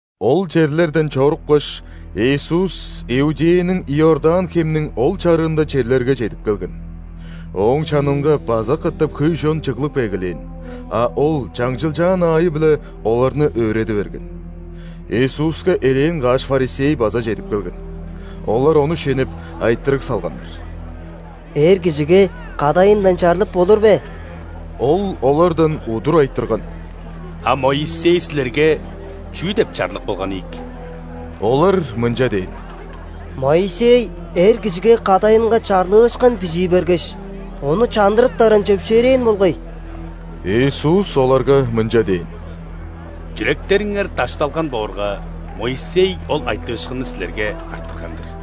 Ол черлерден чорупкаш, Иисус Иудеяның Иордан хемниң ол чарыында черлерге чедип келген. Ооң чанынга база катап хөй чон чыглып эгелээн, а Ол чаңчылчаан аайы-биле оларны өөреди берген. Иисуска элээн каш ·фарисей база чедип келген. Олар Ону шенеп, айтырыг салганнар: «Эр кижиге кадайындан чарлып болур бе?» Ол олардан удур айтырган: «А Моисей силерге чүү деп чарлык болган ийик?» Олар мынча дээн: «Моисей эр кижиге кадайынга чарлыышкын бижии бергеш, ону чандырыптарын чөпшээрээн болгай». Иисус оларга мынча дээн: «Чүректериңер дашталган боорга, Моисей ол айтыышкынны силерге арттырган-дыр.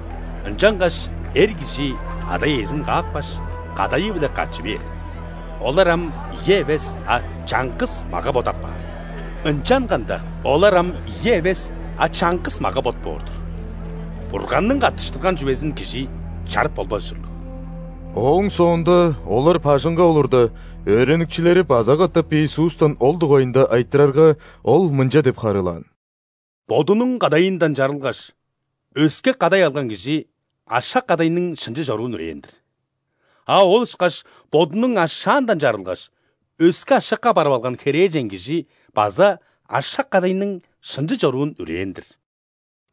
Ынчангаш эр кижи ада-иезин каапкаш, кадайы-биле катчы бээр, олар ам ийи эвес, а чаңгыс мага-бот апаар. Ынчанганда олар ам ийи эвес, а чаңгыс мага-бот боор-дур. Бурганның каттыштырган чүвезин кижи чарып болбас ужурлуг». Ооң соонда олар бажыңга олурда, өөреникчилери база катап Иисустан ол дугайында айтырарга, Ол мынча деп харыылаан: «Бодунуң кадайындан чарылгаш, өске кадай алган кижи ашак-кадайның шынчы чоруун үрээн-дир. А ол ышкаш бодунуң ашаандан чарылгаш, өске ашакка барып алган херээжен кижи база ашак-кадайның шынчы чоруун үрээн-дир».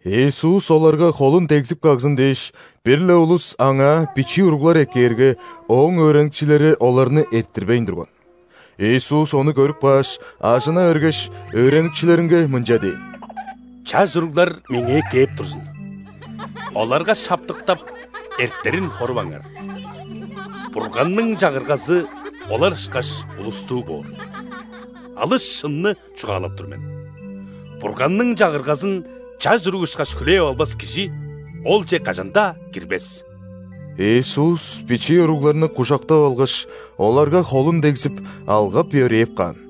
Иисус оларга холун дегзип кагзын дээш, бир-ле улус Аңаа бичии уруглар эккээрге, Ооң өөреникчилери оларны эрттирбейн турган. Иисус ону көрүп кааш, ажына бергеш, өөреникчилеринге мынча дээн: «Чаш уруглар Меңээ кээп турзун, оларга шаптыктап, эртерин хоруваңар! Бурганның Чагыргазы олар ышкаш улустуу боор. Алыс шынны чугаалап тур мен: Бурганның Чагыргазын чаш уруг ышкаш хүлээп албас кижи Олче кажан-даа кирбес». Иисус бичии уругларны кужактап алгаш, оларга холун дегзип, алгап-йөрээп каан.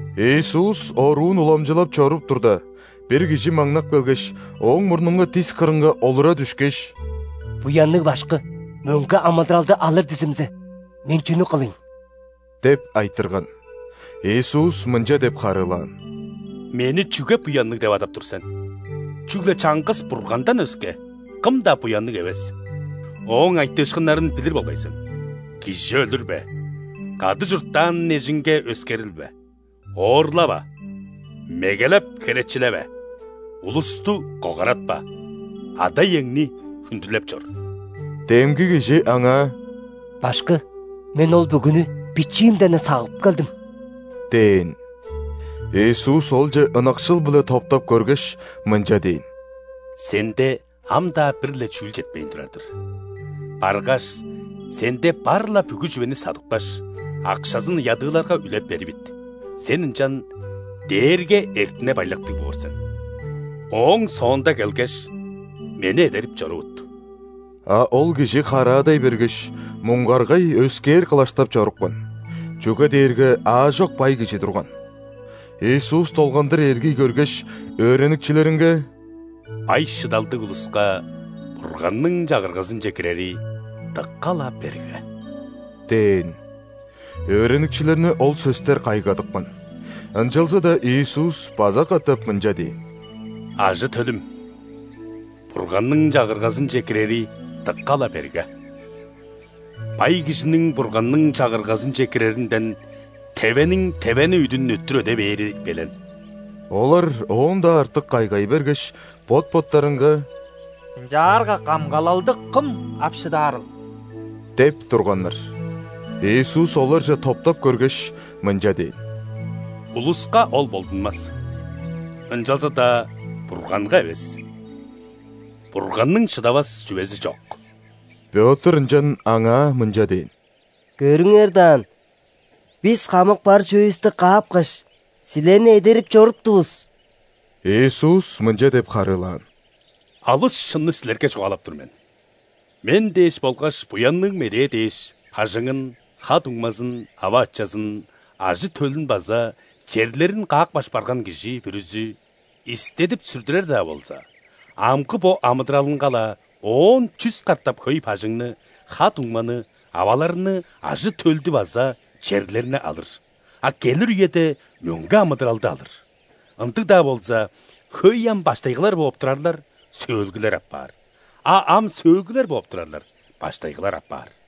Иисус оруун уламчылап чоруп турда, бир кижи маңнап келгеш, Ооң мурнунга дис кырынга олура дүшкеш: «Буянныг Башкы! Мөңге амыдыралды алыр дизимзе, мен чүнү кылыйн?» – деп айтырган. Иисус мынча деп харыылаан: «Мени чүге буянныг деп адап тур сен? Чүгле чаңгыс Бургандан өске, кым-даа буянныг эвес. Ооң айтыышкыннарын билир болгай сен: „Кижи өлүрбе, кады чурттаан эжиңге өскерилбе, оорлава, мегелеп херечилеве, улусту когаратпа, ада-иеңни хүндүлеп чор“». Демги кижи Аңаа: «Башкы, мен ол бүгүнү бичиимден-не сагып келдим» – дээн. Иисус олче ынакшыл-биле топтап көргеш, мынча дээн: «Сенде ам-даа бир-ле чүүл четпейн турар-дыр. Баргаш, сенде бар-ла бүгү чүвени садыпкаш, акшазын ядыыларга үлеп беривит, сен ынчан дээрге эртине-байлактыг боор сен. Ооң соонда келгеш, Мени эдерип чорувут». А ол кижи хараадай бергеш, муңгаргай өскээр кылаштап чорупкан, чүге дээрге аажок бай кижи турган. Иисус долгандыр эргий көргеш, өөреникчилеринге: «Бай-шыдалдыг улуска Бурганның Чагыргазынче кирери дыка-ла берге!» – дээн. Өөреникчилерни ол сөстер кайгадыпкан, ынчалза-даа Иисус база катап мынча дээн: «Ажы-төлүм, Бурганның Чагыргазынче кирери дыка-ла берге! Бай кижиниң Бурганның Чагыргазынче киреринден тевениң тевене үдүн өттүр өде бээри белен». Олар оон-даа артык кайгай бергеш, бот-боттарынга: «Ынчаарга камгалалды кым ап шыдаарыл?» – деп турганнар. Иисус оларже топтап көргеш, мынча дээн: «Улуска ол болдунмас, ынчалза-даа Бурганга эвес. Бурганның шыдавас чүвези чок». Пётр ынчан Аңаа мынча дээн: «Көрүңер даан, бис хамык бар чүвевисти каапкаш, Силерни эдерип чоруптувус». Иисус мынча деп харыылаан: «Алыс шынны силерге чугаалап тур мен: Мен дээш болгаш Буянныг Медээ дээш бажыңын, ха-дуңмазын, ава-ачазын, ажы-төлүн база черлерин каапкаш барган кижи бүрүзү, истедип-сүрдүрер-даа болза, амгы бо амыдыралынга-ла оон чүс катап хөй бажыңны, ха-дуңманы, аваларны, ажы-төлдү база черлерни алыр, а келир үеде – мөңге амыдыралды алыр. Ындыг-даа болза, хөй ам баштайгылар бооп турарлар – сөөлгүлер апаар, а ам сөөлгүлер бооп турарлар – баштайгылар апаар».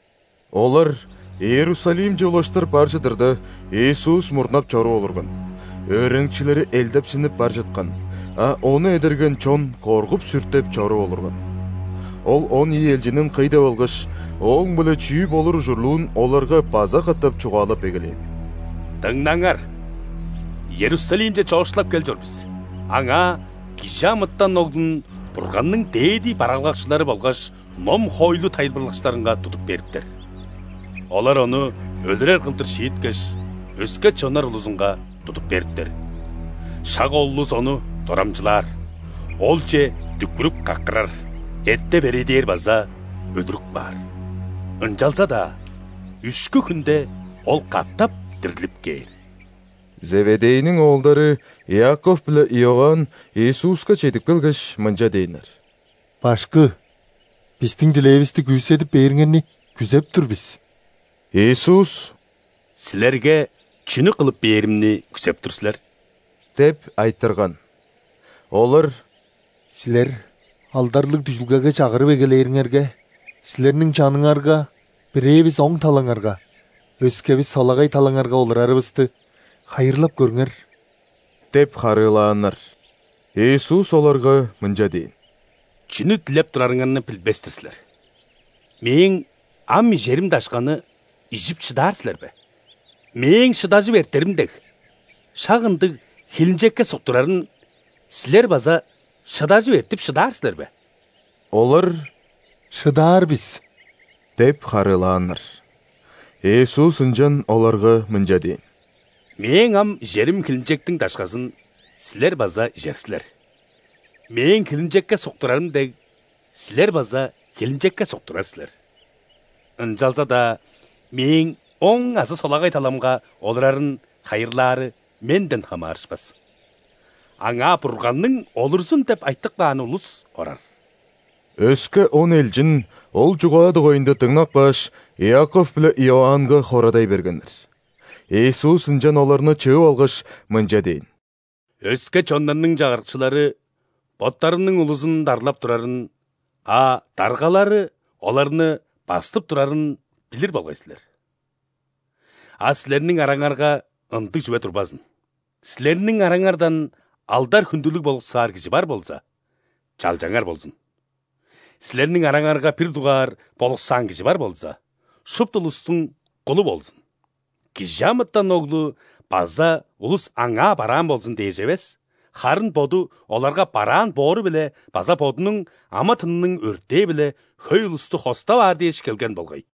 Олар Иерусалимче улаштыр бар чыдырда, Иисус мурнап чоруп олурган. Өөреникчилери элдепсинип бар чыткан, а Ону эдерген чон коргуп-сүртеп чоруп олурган. Ол он ийи элчинин кый деп алгаш, Ооң-биле чүү болур ужурлуун оларга база катап чугаалап эгелээн: «Дыңнаңар, Иерусалимче чоокшулап кел чор бис. Аңаа ·Кижи амытан Оглун Бурганның дээди бараалгакчылары болгаш ном-хоойлу тайылбырлакчыларынга тудуп бериптер. Олар Ону өлүрер кылдыр шииткеш, өске чоннар улузунга тудуп бериптер. Шак ол улус Ону дорамчылаар, Олче дүкпүрүп-каккырар, эттеп-эриидээр база өлүрүп каар. Ынчалза-даа үшкү хүнде Ол катап дирлип кээр». Зеведейниң оолдары Иаков биле Иоанн Иисуска чедип келгеш, мынча дээннер: «Башкы! Бистиң дилээвисти күүседип бээриңерни күзеп тур бис». Иисус: «Силерге чүнү кылып бээримни күзеп тур силер?» – деп айтырган. Олар: «Силер алдарлыг дүжүлгеге чагырып эгелээриңерге, Силерниң чаныңарга: бирээвис – оң талаңарга, өскевис – солагай талаңарга олурарывысты хайырлап көрүңер» – деп харыылааннар. Иисус оларга мынча дээн: «Чүнү дилеп турарыңарны билбес-тир силер. Мээң ам ижерим дашканы ижип шыдаар силер бе? Мээң шыдажып эртерим дег, шак ындыг хилинчекке суктурарын силер база шыдажып эртип шыдаар силер бе?» Олар: «Шыдаар бис» – деп харыылааннар. Иисус ынчан оларга мынча дээн: «Мээң ам ижерим хилинчектиң дашказын силер база ижер силер, Мээң хилинчекке суктурарым дег, силер база хилинчекке суктурар силер. Ынчалза-даа Мээң оң азы солагай таламга олурарын хайырлаары Менден хамаарышпас. Аңаа Бурганның олурзун деп айтып кааны улус орар». Өске он элчин ол чугаа дугайында дыңнап кааш, Иаков биле Иоаннга хорадай бергеннер. Иисус ынчан оларны чыып алгаш, мынча дээн: «Өске чоннарның чагырыкчылары боттарының улузун дарлап турарын, а даргалары оларны бастып турарын билир болгай силер. А силерниң араңарга ындыг чүве турбазын! Силерниң араңардан алдар-хүндүлүг болуксаар кижи бар болза, чалчаңар болзун. Силерниң араңарга бир дугаар болуксаан кижи бар болза, шупту улустуң кулу болзун. ·Кижи амытан Оглу база улус Аңаа бараан болзун дээш эвес, харын Боду оларга бараан боору-биле база Бодунуң амы-тынының өртээ-биле хөй улусту хостап аар дээш келген болгай».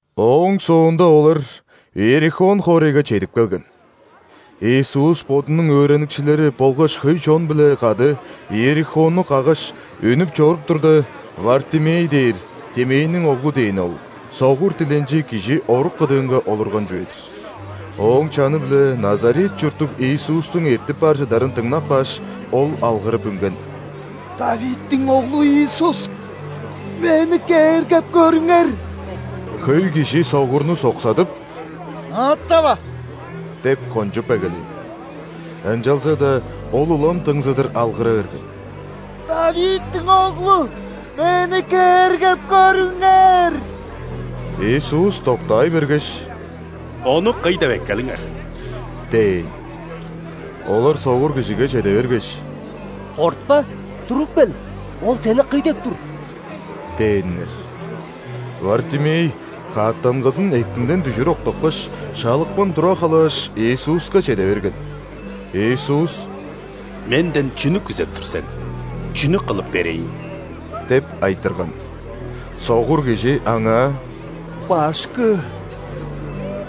Ооң соонда олар Иерихон хоорайга чедип келген. Иисус Бодунуң өөреникчилери болгаш хөй чон-биле кады Иерихонну каггаш, үнүп чоруп турда, Вартимей дээр (Тимейниң оглу дээни ол) согур диленчи кижи орук кыдыынга олурган чүве-дир. Ооң чаны-биле Назарет чурттуг Иисустуң эртип бар чыдарын дыңнап кааш, ол алгырып үнген: «·Давидтиң Оглу Иисус! Мени кээргеп көрүңер!» Хөй кижи согурну соксадып: «Ыыттава!» – деп кончуп эгелээн. Ынчалза-даа ол улам дыңзыдыр алгыра берген: «Давидтиң Оглу! Мени кээргеп көрүңер!» Иисус доктаай бергеш: «Ону кый деп эккелиңер» – дээн. Олар согур кижиге чеде бергеш: «Кортпа! Туруп кел, Ол сени кый деп тур!» – дээннер. Вартимей каъттангызын эктинден дүжүр октапкаш, шалыпкын тура халааш, Иисуска чеде берген. Иисус: «Менден чүнү күзеп тур сен? Чүнү кылып берейн?» – деп айтырган. Согур кижи Аңаа: «Башкы!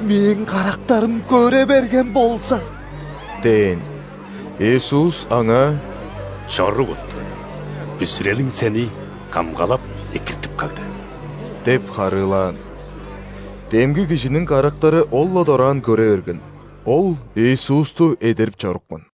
Мээң карактарым көре берген болза!» – дээн. Иисус аңаа: «Чорувут, бүзүрелиң сени камгалап-экиртип кагды» – деп харыылаан. Демги кижиниң карактары ол-ла дораан көре берген, ол Иисусту эдерип чорупкан.